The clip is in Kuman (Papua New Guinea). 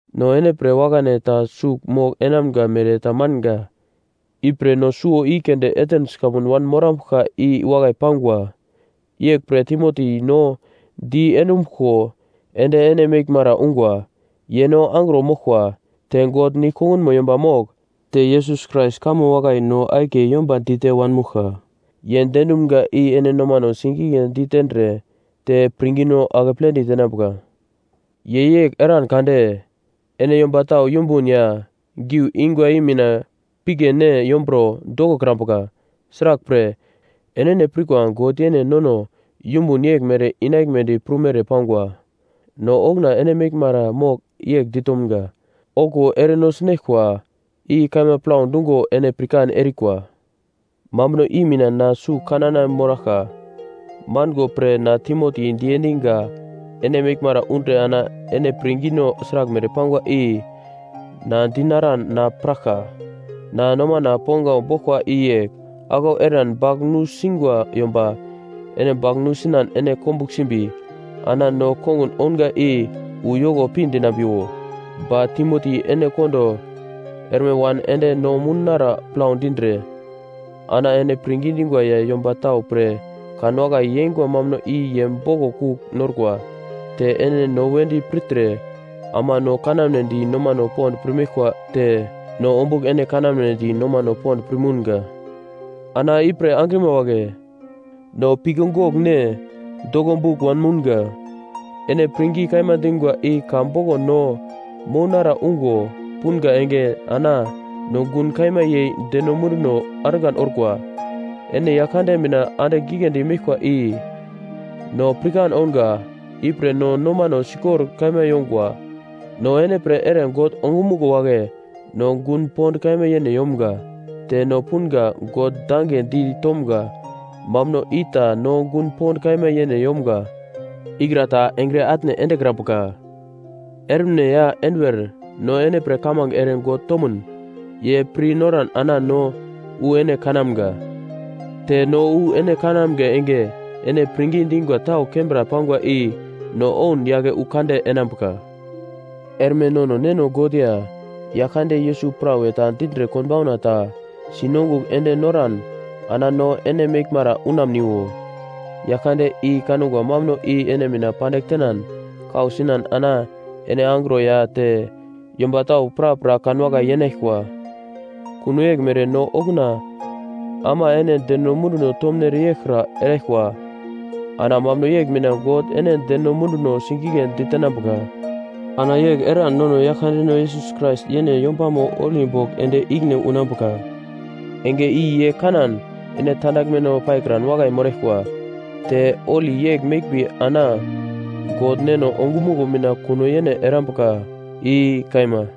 No ene pre wakane ta sugl mogl enamga mere ta manga. Ipre no suwo i keunde Atens kamun wanmorambuglka i wakai pangwa. Yeglpre Timoti no de dumbuglko ende ene meglmara unga. Ye no angro moglkwa. Te God nigl kongunmo yomba mogl, te Yesus Krais kamo wakai no akiye yomba dite wanmouglka, ye diendumga i ene nomano sigigledi tendre te pirngino akepledi tenambuka. Ye yegl eran kade, ene yomba tau yumbun ya giu ingwa i mina pigle ne yomburo dokokrambuka. Sraglpre, enene pirkwa God yene nono yumbun yeglmere inaglmedi prumere pangwa. No okuna ene meglmara mogl yegl ditomga, “Okuwo ere no sinaglkwa.” I kaima plau dungo ene pirkan erikwa. Mambuno i mina na sugl kanana moraglka mango pre na Timoti diendinga ene meglmara undre ana ene pirngino sraglmere pangwa i na dinaran na piraglka. Na nomana ponglau boglkwa i yegl, aglau eran bagl nusungwa yomba ene bagl nusinan ene komugl simbi ana no kongun ounga i uyoko pi dinambiwo. Ba Timoti ene kondo erme wan ende no mounara plau dindre ana ene pirngi dingwa ya yomba tau pre kanwakai yengwa mambuno i ye boglo kugl norkwa. Te ene no wedi pirtre ama no kanamnedi nomano pond pirmeglko te no ombugl ene kanamnedi nomano pond pir mounga. Ana ipre angrima wagle, no pigle goglne doglobugl wanmounga, ene pirngi kaima dingwa i ka boglo no mounara ungo punga enge ana no gun kaima yei deno munduno argan orkwa. Ene Yaglkande mina andigl giglendi meglkwa i no pirkan ounga. Ipre no nomano sikor kaima yongwa. No ene pre ere God ongumuglo wagle no gun pond kaima yene yomga, te no punga God dange di tomga mambuno ita no gun pond kaima yene yomga ikra ta engre atne endekrambuka. Ermine ya enduwer no ene pre kamange ere God tomun ye pir noran ana no wu ene kanamga. Te no wu ene kanamga enge ene pirngi dingwa tau kembra pangwa i no oun yake wu kande enambuka. Erme nono neno God ya Yaglkande Yesus prawe ta dindre konbauna ta si nongugl ende noran ana no ene meglmara unamniwo. Yaglkande i kangwa mambuno i ene mina pandigl tenan kau sinan ana ene angro ya te yomba tau prapra kanwakai yeinaglkwa. Kuno yeglmere no okuna ama ene deno munduno tomunere yeglkra eraglkwa. Ana mambuno yegl mina God ene deno munduno sigigle ditenambuka. Ana yegl eran nono Yaglkandeno Yesus Krais yene yombamo holi bogl ende ikine unambuka. Enge i ye kanan ene tandaglmeno paikran wakai moraglkwa. Te holi yegl meglmbi ana God Neno ongumuglo mina kuno yene erambuka, i kaima.